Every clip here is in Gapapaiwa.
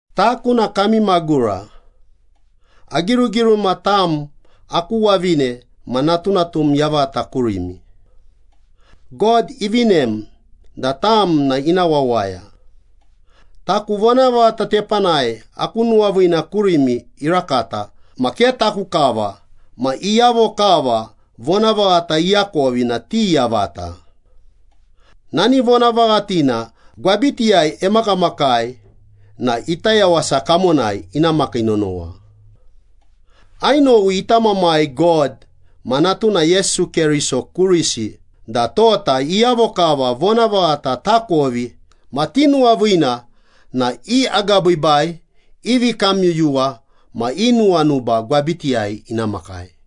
Taku na kami magura. Agirugiruma tam aku wavine ma natunatum yavata kurimi. God ivinem da tam na ina wawaya. Taku vonavaghata tepanai aku nuwaviina kurimi irakata ma ke taku kava ma iyavo kava vonavaghata iakovi na ti yavata. Nani vonavaghatina gwabitiyai emakamakai na ita yawasa kamonai ina makii nonowa. Ainowi ita Mamai God ma Natuna Yesu Keriso kurisi da tota iyavo kava vonavaghata takovi ma tinuwaviina na i agabiibai, i vikamyuyuwa ma i nuwanuba gwabitiyai ina makai.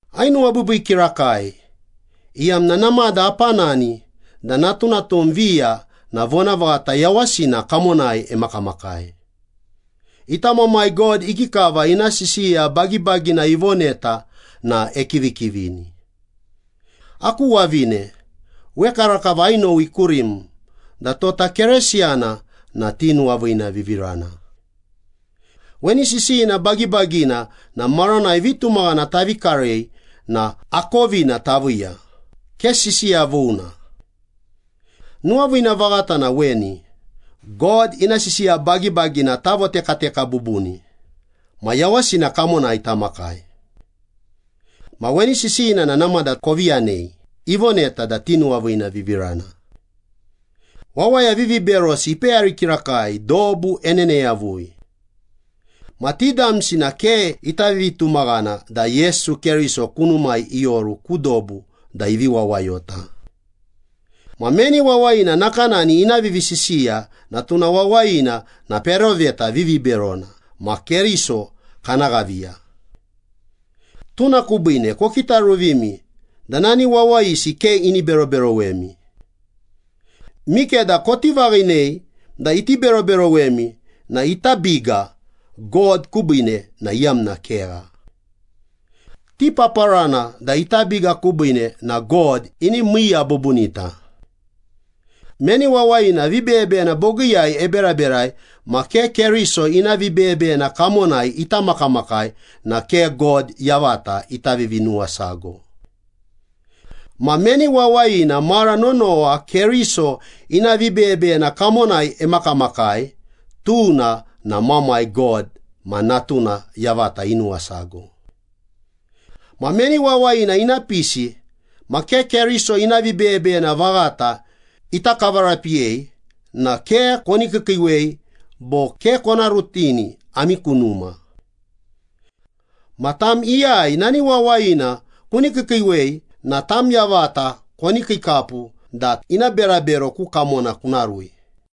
Ainuwabiibii kirakai, iyamna namada apanani da natunatum viya na vonavaghata yawasina kamonai emakamakai. Ita Mamai God ikikava ina sisiya bagibagina ivoneta na ekivikivini. Aku wavine, wekarakava ainowi kurim da tota Keresiyana na tinuwaviinavivirana. Weni sisiyina bagibagina na maranai vitumaghana tavi karei na akovina taviiya, ke sisiya vuna. Nuwaviina vaghata na weni, God ina sisiya bagibagina tavotekateka bubuni ma yawasina kamonai tamakai. Ma weni sisiyina na namada kovi yanei, ivoneta da tinuwaviinavivirana. Wawaya viviberosi ipeyari kirakai dobu enene yavui. Ma ti damsi na ke ita vivitumaghana da Yesu Keriso kunumai ioru ku dobu da ivi wawayota. Ma meni wawayina nakanani ina vivisisiya na tuna wawayina na peroveta viviberona ma Keriso kana ghaviya. Tuna kubiine kokitaruvimi da nani wawayisi ke ini beroberowemi. Mikeda koti vaghinei da iti beroberowemi na ita biga God kubiine na iyamna kegha. Tipaparana da ita biga kubiine na God ini miiya bubunita. Meni wawayina vibeyebeyena bogiiyai eberaberai ma ke Keriso ina vibeyebeyena kamonai ita makamakai na ke God yavata ita vivinuwasago. Ma meni wawayina mara nonowa Keriso ina vibeyebeyena kamonai emakamakai, tuna na Mamai God ma Natuna yavata inuwasago. Ma meni wawayina ina pisi ma ke Keriso ina vibeyebeyena vaghata ita kavarapiyei na ke koni kiikiiwei bo ke kona rutini ami ku numa. Ma tam iyai nani wawayina kuni kiikiiwei na tam yavata koni kiikapu da ina berabero ku kamona kuna rui.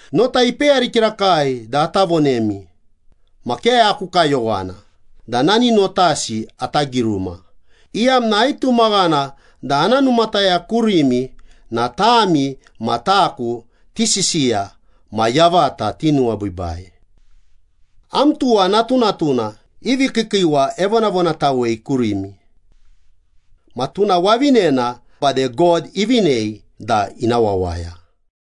Nota ipeyari kirakai da ata vonemi, ma ke aku kayowana da nani notasi ata giruma, iyamna aitumaghana da ana numataya kurimi da tami ma taku tisisiya ma yavata tinuwabiibai. Am tuwa natunatuna i vikiikiiwa evonavonatawei kurimi. Ma tuna wavinena bade God ivinei da ina wawaya.